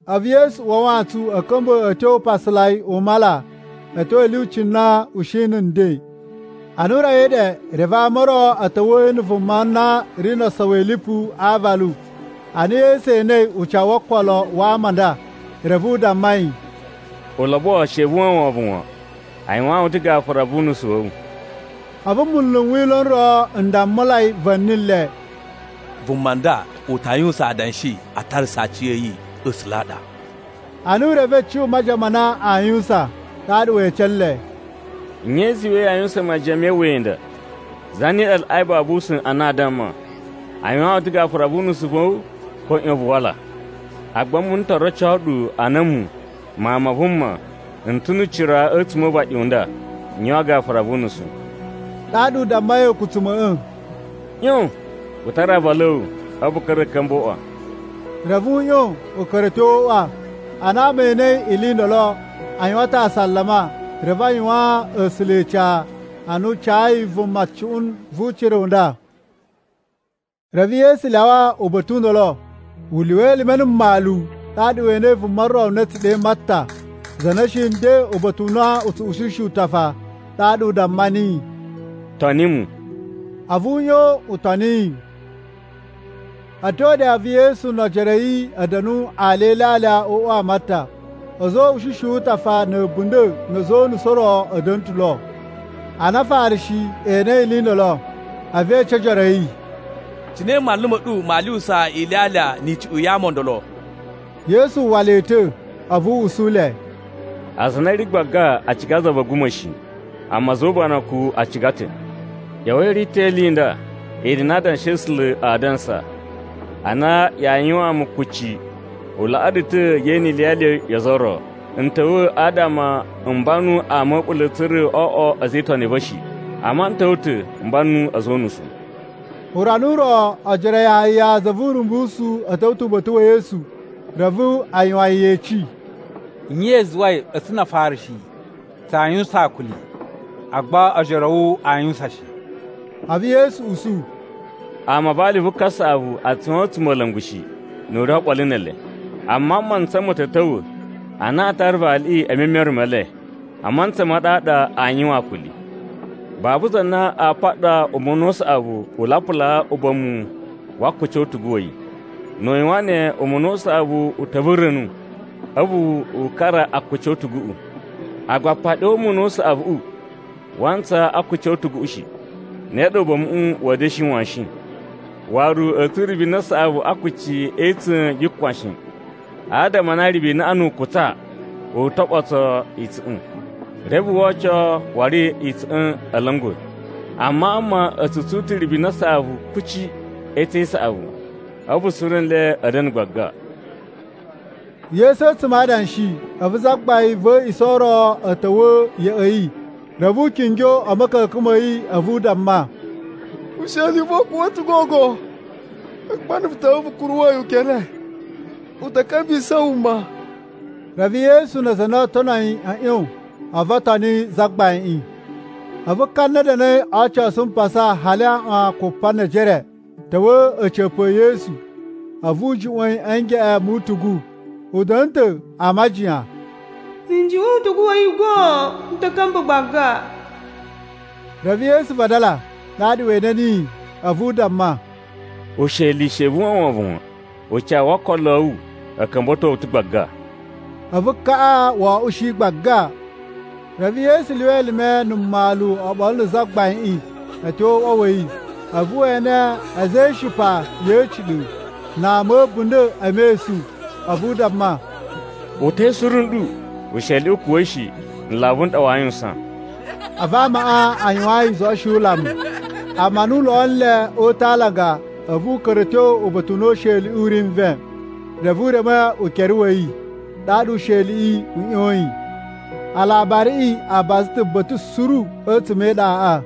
A̱vu Yesu uwa a wantsun a̱ ka̱mba̱ a̱ tyo upasalai u mala a̱ tyo a̱ lyuci na u shi na̱ nden. Ana u rawai ɗe, reve ama o ro a̱ ta̱wa̱a̱ yi na̱ vuma na ri no osowi a̱ lipu a aavalu. Ana Yesu enei ucawu wo okolo wa ama a nda, reve u damma yi, “Ulobo, she vu uwwa wovon wan. A yuwaan wu ta̱ gafura wu unusu wa̱ wu.” A̱vu munlu n Wila̱ n ro n dammulai va̱ni le, “Vuma nda u ta yuwusan adanshi a tarasa aciya̱yi A̱sula̱ a ɗa!” Ana u revei cuꞌun majiyan ma na aa yuwusan, ɗaɗa we ece nle, “Nye i zuwai yaa yuwusan majiyan me iwuya i nda? Zane ɗa laꞌai babu usa̱n a na a damma, ‘A yuwaan wu ta̱ gafura wu unusu wa̱ wu,’ ko ‘ꞌYon vu wala?’ Agba a̱mu n to roco ɗu a na a̱mu, Mawun ma Vuma, n ta̱ nu ucira a̱tsuma̱ o uvaɗi u nda n yuwan gafura vu unusu.” Ɗaɗa u dammai a̱a̱kutsuma̱ꞌa̱, “ꞌYon, vu tara aavalu a̱ wu, a̱vu vu ka̱ra̱ a̱ ka̱mba̱ o uꞌwa.” Reve u ꞌyon u ka̱ra̱ a̱ tyo o uꞌwa. Ana ama e enei ili i ndolo, a yuwan ta̱ asalama, reve a yuwaan A̱sula̱ ica a na u cayi vuma cuꞌun vu ucira u nda. Reve Yesu lyawa uba̱ta̱ u ndolo, u lyuwa elime na̱ mmalu, ɗaɗa we enei vuma ro na a̱ tsu ɗe Matta, za na shi nden uba̱ta̱ u na u tsu ushishi utafa. Ɗaɗa u damma niyi, “Toni mu.” A̱vu u ꞌyon u toni yi. A̱ tyo ɗe, a̱vu Yesu no ojoro a̱ yi a̱ da̱nu alya e ilyalya o uꞌwa wa Matta. A̱za̱ o uꞌushishi wu utafa na̱ a̱bunda̱ na̱ a̱za̱ o unusu o ro a̱ da̱na̱ ta̱ lo. Ana Afarishi enei ili i ndolo, a̱vu e ece ojoro a̱ yi, “Cine manlu ma̱ ɗu maa lyuwusa ilyalya ni icuꞌun ya ama o ndolo?” Yesu uwwa le ta̱ a̱vu u usu le, “Aza a na a̱ ri gbaga a ciga za va̱ a̱guma̱ shi, amma a̱za̱ o ubanakun a ciga ta̱. ꞌYa̱wa̱i i rito ili i nda i na Adanshi a̱ A̱sula̱ aa dansa, ‘Ana yaa yuwaan mu kucci, u laꞌaa ɗu ta̱ ye ene iliyali yo ozo o ro.’ N ta̱wa̱ adama m banu ama a̱ a̱ɓula̱ tsa̱ra̱ o oꞌwo a̱za̱ e itoni a̱ va̱ shi. Amma n ta̱wa̱ ta̱ m banu a̱za̱ o unusu.” Urana u ro, ojoro a Yahaya za vu Urumbusu a̱ ta̱wa̱ ta̱ uba̱ta̱ wa̱ Yesu, reve a yuwan yi yeci, “Nye i zuwai a̱tsu na Afarishi tsaa yuwusan akuli, agba ojoro a̱ wu aa yuwusan shi?” A̱vu Yesu usu, “Ama a vali vu kasaꞌavu a tsu yuwan a̱tsumola̱ngu shi, nu u ri oɓolo ne ele. Amma mantsa ma̱ ta̱ ta̱wa̱ a na aa tara valiꞌi e memere me le, a mantsa ma ɗaɗa aa yuwan akuli. “Babu za na a paɗa umuna u saꞌavu u lapulaa uba̱mu wa akuci o utugu wa̱ yi. Nu u yuwan ne, umuna u saꞌavu u ta̱ vura̱nu a̱vu u kara akuci o utuguꞌu, agba apaɗi o umuna u saꞌavuꞌu waa ntsaa a akuci o utuguꞌu shi. Ne ɗa uba̱muꞌu wa̱a̱ da̱shi washin. Waru, a̱a̱ tsun ribina saꞌavu a akuci e itsa̱n yu kwan shi, adama a na ribinaꞌa nu u kutsa, u to ɓoso itsa̱ꞌa̱n, reve woo oco waru itsa̱ꞌa̱n a̱ la̱nga̱. Amma ama a̱ tsu tsun ta̱ ribina saꞌavu kuci e itsa̱n i saꞌavu. A̱vu suru nle a̱ da̱na̱ gbaga.” Yesu a̱tsuma̱ a adanshi, a̱vu zagbain va̱ a̱a̱ꞌisa̱ ro ta̱wa̱ ya̱ꞌa̱ yi. Reve u kingyo a̱ ma̱ka̱ka̱n ma̱ yi a̱vu u damma, “Usheli u va̱ u kuwa̱ ta̱ gogo. Agba na̱ vu ta̱wa̱ vu kuruwa̱ yi ukere, u ta̱ ka̱mbisa̱ wuma.” Reve Yesu na aza a na oo tono yi a̱ ꞌyon a̱vu o toni zagbaiꞌin. A̱vu ka na da̱na̱i o ocosu mpasa hali aꞌwan kupa ne ejere ta̱wa̱ a̱ca̱pa̱ e Yesu, a̱vu u juꞌwa̱n yi ngeꞌen mu utugu. U da̱na̱ ta̱ a majiyan, “Na̱ n juꞌwa̱n utugu wa̱ yi goon, n ta̱ ka̱mba̱ gbaga.” Reve Yesu vadala ɗaɗa we ene niyi, a̱vu u damma, “Usheli, she vu uwwa wovon wan! Ucawu wo okolo a̱ wu u ka̱mba̱to wu ta̱ gbaga.” A̱vu kaꞌa wo oꞌushi gbaga. Reve Yesu lyuwa elime na̱ mmalu oɓolo na̱ zagbaiꞌin a̱ tyo o uꞌwa wa̱ yi, a̱vu we ene a̱za̱ e ishipa ya̱ a̱ciɗa̱ na ama a̱ a̱bunda̱ e mesun. A̱vu u damma, “Uta̱i suru nɗu! Usheliꞌi u kuwa̱ shi. Nlavu n ɗa waa yuwusan.” A̱vu amaꞌa a yuwaan yi izoꞌoshi yu ulamu. Amma ana o lo nle o uta̱ a alanga, a̱vu u ka̱ra̱ a̱ tyo uba̱ta̱ u na usheliꞌi u ri nven. Reve u reme yi ukere, ɗaɗa usheliꞌi u ꞌyoyin. Alabariꞌi a baza ta̱ uba̱ta̱ suru a̱tsuma̱ e iɗaꞌa.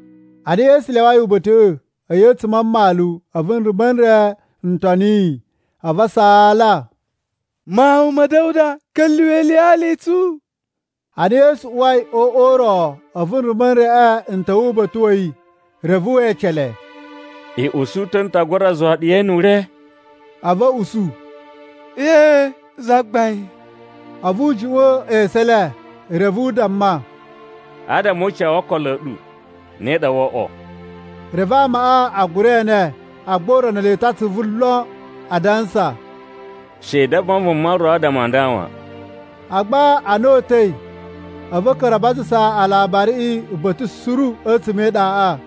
Ana Yesu lyawai uba̱ta̱ꞌa̱, a̱yi a̱tsuma̱ a mmalu, a̱vu nrumba̱ n re n toni yi. A̱vu a saala, “Mawun ma̱ Da̱wuda, ka̱lyuwa̱ iliyali i tsu!” Ana Yesu uwai o uꞌwa u ro, a̱vu nrumba̱ n reꞌe n ta̱wa̱ uba̱ta̱ wa̱ yi. Reve we ece le, “I usu ta̱ n ta gura zuwa ɗu ye ene ure?” A̱vu a̱ usu, “Ee, Zagbain.” A̱vu u juꞌwa̱n esu e le reve u damma, “Adama o ucawu wo okolo a̱ ɗu, ne ɗa woo oꞌwo.” Reve amaꞌa a gura ene. Agba u rono le ta̱ atsuvu lon, adansa, “She i damma vuma ro adama a nda wan.” Agba ana o uta̱i a̱vu a̱ ka̱ra̱ a bazasa alabariꞌi uba̱ta̱ suru a̱tsuma̱ e iɗaꞌa.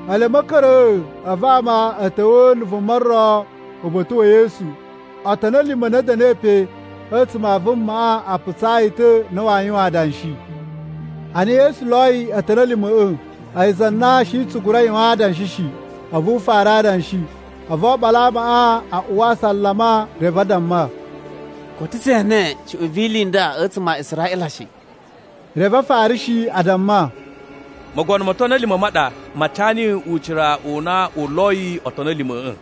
Ele a̱ ma̱ka̱ra̱a̱, a̱vu ama a̱ ta̱wa̱a̱ na̱ vuma ro uba̱ta̱ wa̱ Yesu. Otoni a̱ lima̱ a na a̱ da̱na̱i pe a̱tsuma̱ a vumaꞌa a putsaa yi ta̱ a na waa yuwan adanshi. Ana Yesu loyi otoni a̱ lima̱ꞌa̱, a̱yi za na shi tsu gura yuwan adanshi shi, a̱vu u fara adanshi. A̱vu oɓolo a amaꞌa a uwa asalama reve a damma, “Koto tse ene cuꞌun vi ili i nda a̱tsuma̱ a Israꞌila shi.” Reve Afarishi a damma, “Mogono mo otoni a̱ lima̱ ma ɗa ma ca niyi ucira u na u loyi otoni a̱ lima̱ꞌa̱.”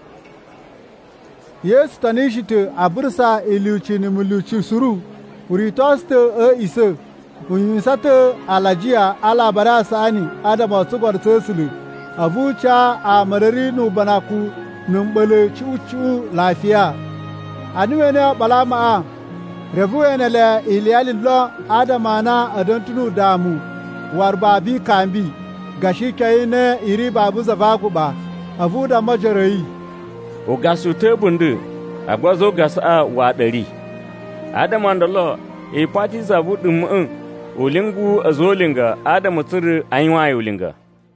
Yesu tonishi ta̱ a burusa ilyuci na̱ mulyuci suru. U ritosu ta̱ a̱ a̱ꞌisa̱, u yuwan ta̱ alajiya a Alabari a Saꞌani adama o tsugono tsa̱ A̱sula̱, a̱vu u ca ama a na a̱ ri ubanakun na̱ mɓa̱la̱ icuꞌun icuꞌun lafiya. Ana we enei oɓolo a amaꞌa, reve we ene le iliyali lon, adama a na a̱ da̱na̱ ta̱ udamu waru babu ikambi, gashi ikyon i na i ri babu za va aguɓa. A̱vu u damma ojoro a̱ yi, “Ugasa u ta̱ a̱bunda̱, agba a̱za̱ o ugasaꞌa waꞌa ɗa a̱ ri. Adama o ndolo i pati za vu uɗuma̱ꞌa̱ u lyungu a̱za̱ o ulinga adama tsa̱ra̱ a yuwaan yi ulinga.”